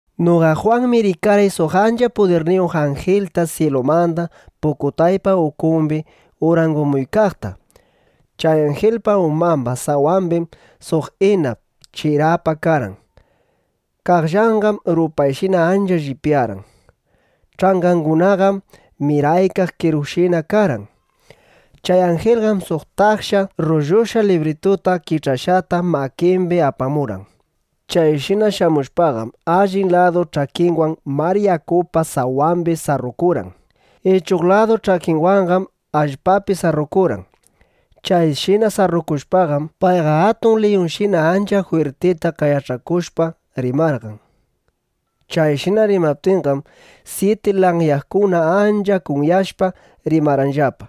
Noqa Jwanmi rikarqay suq ancha pudirniyuq anjilta syilumanda pukutaypa ukumbi urangumuykaqta. Chay anjilpa umamba sawambim suq inap (chirapa) karqan. Qaqllanqam rupayshina ancha llipyarqan. Ch'angangunaqam miraykaq qerukunashina karqan. Chay anjilqam suq taksha rrullushqa librituta kich'ashqata makimbi apamurqan. Chayshina shamushpaqam, allin ladu ch'akinwan mar yakupa sawambi sarrukurqan, ichuq ladu ch'akinwanqam allpapi sarrukurqan. Chayshina sarrukushpaqam, payqa atun liyunshina ancha jwirtita qayach'akushpa rimarqan. Chayshina rimaptinqam, syiti lanyakuna ancha kunyashpa, rimarqanllapa.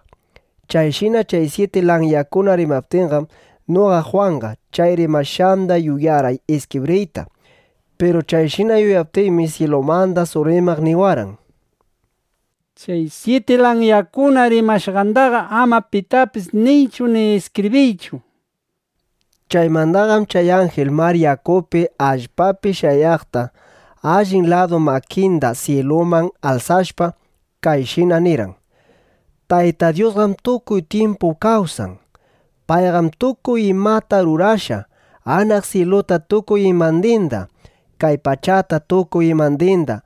Chayshina chay syiti lanyakuna rimaptinqam, noqa Jwanqa chay rimashqanda yuyarqay iskibriyta. Piru chayshina yuyaptiymi, syilumanda suq rimaq niwarqan: —Chay syiti lanyakuna rimashqandaqa ama pitapis niychu ni iskibriychu, nishpa. Chaymandaqam chay anjil mar yakupi, allpapi shayaqqa allin ladu makinda syiluman alsashpa, kayshina nirqan: —Tayta Dyusqam tukuy tyimpu kawsan. Payqam tukuy imata rurashqa: anaq syiluta tukuy imandinda, kay pachata tukuy imandinda,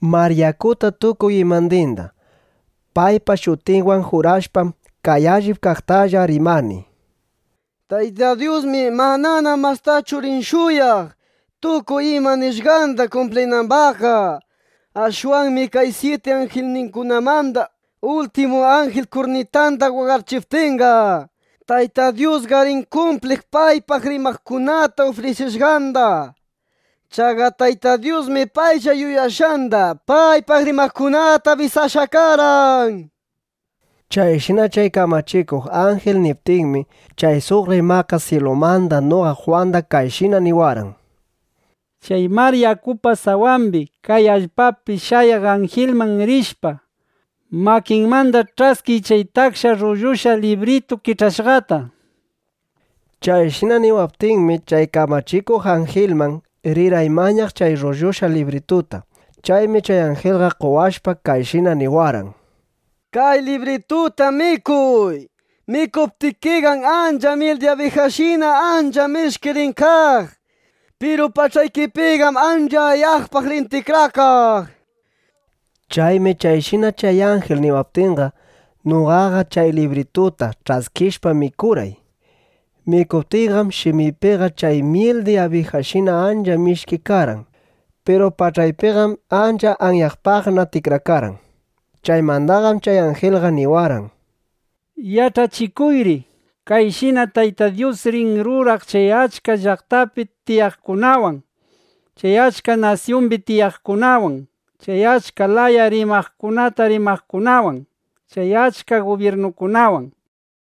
mar yakuta tukuy imandinda. Paypa shutinwan jurashpam, kay allip kaqtalla rimani: Tayta Dyusmi manana mastachu rin shuyaq, tukuy ima nishqanda kumplinambaqqa. Ashwanmi kay syiti anjilkunamanda ultimu anjil kurnitanda waqachiptinqa, Tayta Dyusqa rin kumpliq paypaq rimaqkunata ufrisishqanda. Chaqa Tayta Dyusmi paylla yuyashqanda paypaq rimaqkunata abisashqa karqan, nishpa. Chayshina chay kamachikuq anjil niptinmi, chay suq rimaqqa syilumanda noqa Jwanda kayshina niwarqan: —Chay mar yakupa sawambi, kay allpapi shayaq anjilman rishpa, makinmanda ch'askiy chay taksha rrullushqa libritu kich'ashqata, nishpa. Chayshina niwaptinmi, chay kamachikuq anjilman rirqay mañaq chay rrullushqa librituta. Chaymi chay anjilqa qowashpa, kayshina niwarqan: —Kay librituta mikuy. Mikuptikiqam chay myil di abijashina ancha mishki rin kaq. Piru pach'aykipiqam ancha ayaqpaq rin tikrakaq, nishpa. Chaymi chayshina chay anjil niwaptinqa, noqaqa chay librituta ch'askishpa mikurqay. Mikuptiyqam shimiypiqa chay myil di abijashina ancha mishki karqan. Piru pach'aypiqam ancha ayaqpaqna tikrakarqan. Chaymandaqam chay anjilqa niwarqan: —Yach'achikuyri: “Kayshinam Tayta Dyus rin ruraq chay achka llaqtapi tiyaqkunawan, chay achka nasyumbi tiyaqkunawan, chay achka laya rimaykunata rimaqkunawan, chay achka gubyirnukunawan”, nishpa.